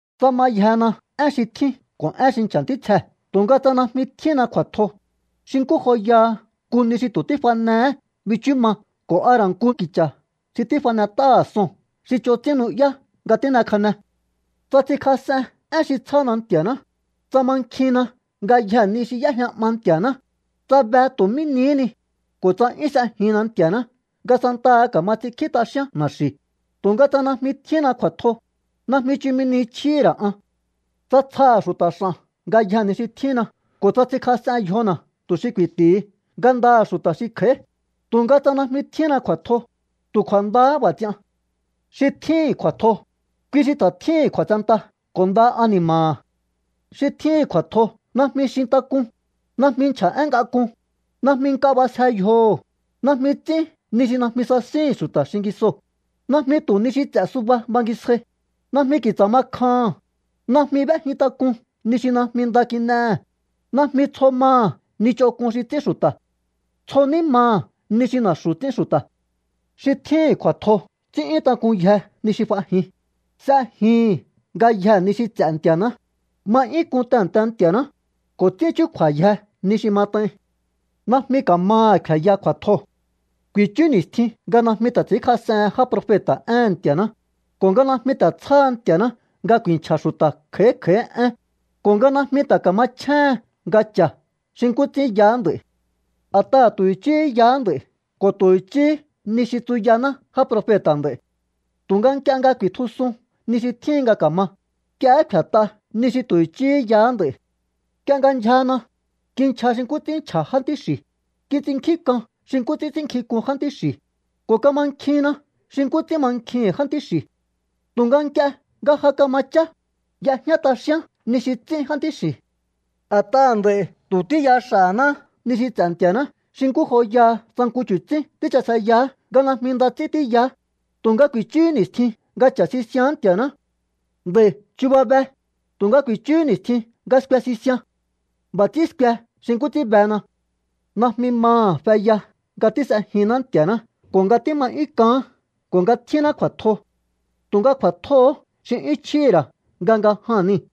Tsa mayjena én xi tjín ko̱ én xi nchja̱ ntítsjee̱ tu̱nga tsa najmi tjíhínna kju̱a̱tjo, xi nkú joyaha nku ni xi tu̱ tífanehé bichú ma ko̱ a ra̱ nku ki̱cha̱ xi tífanet'áha̱ son xi ch'on ts'ín nu'yá nga tín'ekjane. Tsa ts'inkjas'en én xi tsjána Nti̱a̱ná, tsa mankjinna ngayjee̱ ni xi y'éjña 'ma Nti̱a̱ná, tsa be tu̱ mí nihí ni, ko̱ tsa 'yún s'ejinna Nti̱a̱ná nga santaha ka̱ma ts'inkjí t'axíán na̱xi̱, tu̱nga tsa najmi tjíhínna kju̱a̱tjo, najmi chumi ni chjíhi̱ ra̱ an. Tsa tsjaha̱ xu̱ta̱ x'a̱n ngayjee̱ ni xi tjínna ko̱ tsa ts'inkjas'en yjona̱ tu̱ xi ku̱i̱ti̱hi ngandaha̱ xu̱ta̱ xi kj'a̱í, tu̱nga tsa najmi tjíhínna kju̱a̱tjo, tu̱ kju̱a̱ndahá b'a̱ ts'ian. Xi tjíhi̱n kju̱a̱tjo, kui xi ta̱ tjíhi̱n kju̱a̱tsenta ko̱ nda ani̱ma̱ha̱. Xi tjíhi̱n kju̱a̱tjo najmi xintak'un, najmi nchja̱ én ngak'un, najmi nk'a b'asje yjoho̱, najmi ts'ín ni xi najmi sasíhi̱n xu̱ta̱ xingisoo̱, najmi tu̱ ni xi ts'e̱ subahá bangisjai, najmi ki̱tsa̱ ma kjaha̱n, najmi b'éjin tak'un ni xi najmi nda kin'ehe̱, najmi tsjo maha̱ ni ch'onk'un xi ts'ín xu̱ta̱. Tsjo ní maha̱ ni xi na̱xu̱ ts'ín xu̱ta̱. Xi tjíhi̱n kju̱a̱tjo ts'ín'yún tak'unyje ni xi f'ajin, s'ejihi̱n ngayjee̱ ni xi ts'e̱ Nti̱a̱ná, ma 'yún k'un tehe̱nte Nti̱a̱ná, ko̱ ts'ín chúkju̱a̱yje ni xi mat'ain. Najmi ka̱maha̱ kfe̱ya kju̱a̱tjoo̱. Ku̱i̱chú ni̱stjin nga najmi ta̱ ts'i̱ínkjas'ehen já profeta̱ éhe̱n Nti̱a̱ná, ko̱ nga najmi ta̱ tsjáha Nti̱a̱ná nga ku̱i̱nchja̱ xu̱ta̱ kj'a̱í kj'a̱í én, ko̱ nga najmi ta̱ ka̱machjéhen nga cha̱ xi nkú ts'ín yaá nd'a̱i̱. A̱t'aha̱ tu̱ i̱chíhí yaá nd'a̱i̱ ko̱ tu̱ i̱chíhí ni xi tsuyaná já profeta̱ nd'a̱i̱, tu̱nga nk'ie nga ku̱i̱tjusun ni xi tjíhin nga ka̱ma, nk'iehé kfe̱t'a ni xi tu̱ i̱chíhí yaá nd'a̱i̱. Nk'ie nga ndyjana, kinchja xi nkú ts'ín nchja̱ jántí xi̱, kits'innkjíhi̱n k'an xi nkú ts'ín ts'ínnkjink'un jántí xi̱, ko̱ kamankjinna xi nkú ts'ín mankjihi̱n jántí xi̱. Tu̱nga nk'ie nga ja kama chá, y'ejñá t'axíán ni xi ts'ín jántí xi̱. A̱t'aha̱ nd'a̱i̱ tu̱ tíya xa̱náá ni xi ts'e̱ Nti̱a̱ná xi nkú joyaha tsa nku chu̱tsín tíchaseyaá nga najmi nda ts'ín tíyaá, tu̱nga ku̱i̱chúhú ni̱stjin nga cha̱ sisián Nti̱a̱ná. Nd'a̱i̱ chuba be, tu̱nga ku̱i̱chúhú ni̱stjin nga skue sisian. B'a̱ ts'ín skue xi nkú ts'ín bena. Najmi maha̱ feya nga tís'ejinná Nti̱a̱ná ko̱ nga tíma 'yún k'aán ko̱ nga tjínná kju̱a̱tjo. Tu̱nga kju̱a̱tjoo̱hó xi 'yún chjíhi̱ ra̱ nga nga jaa̱n nii̱.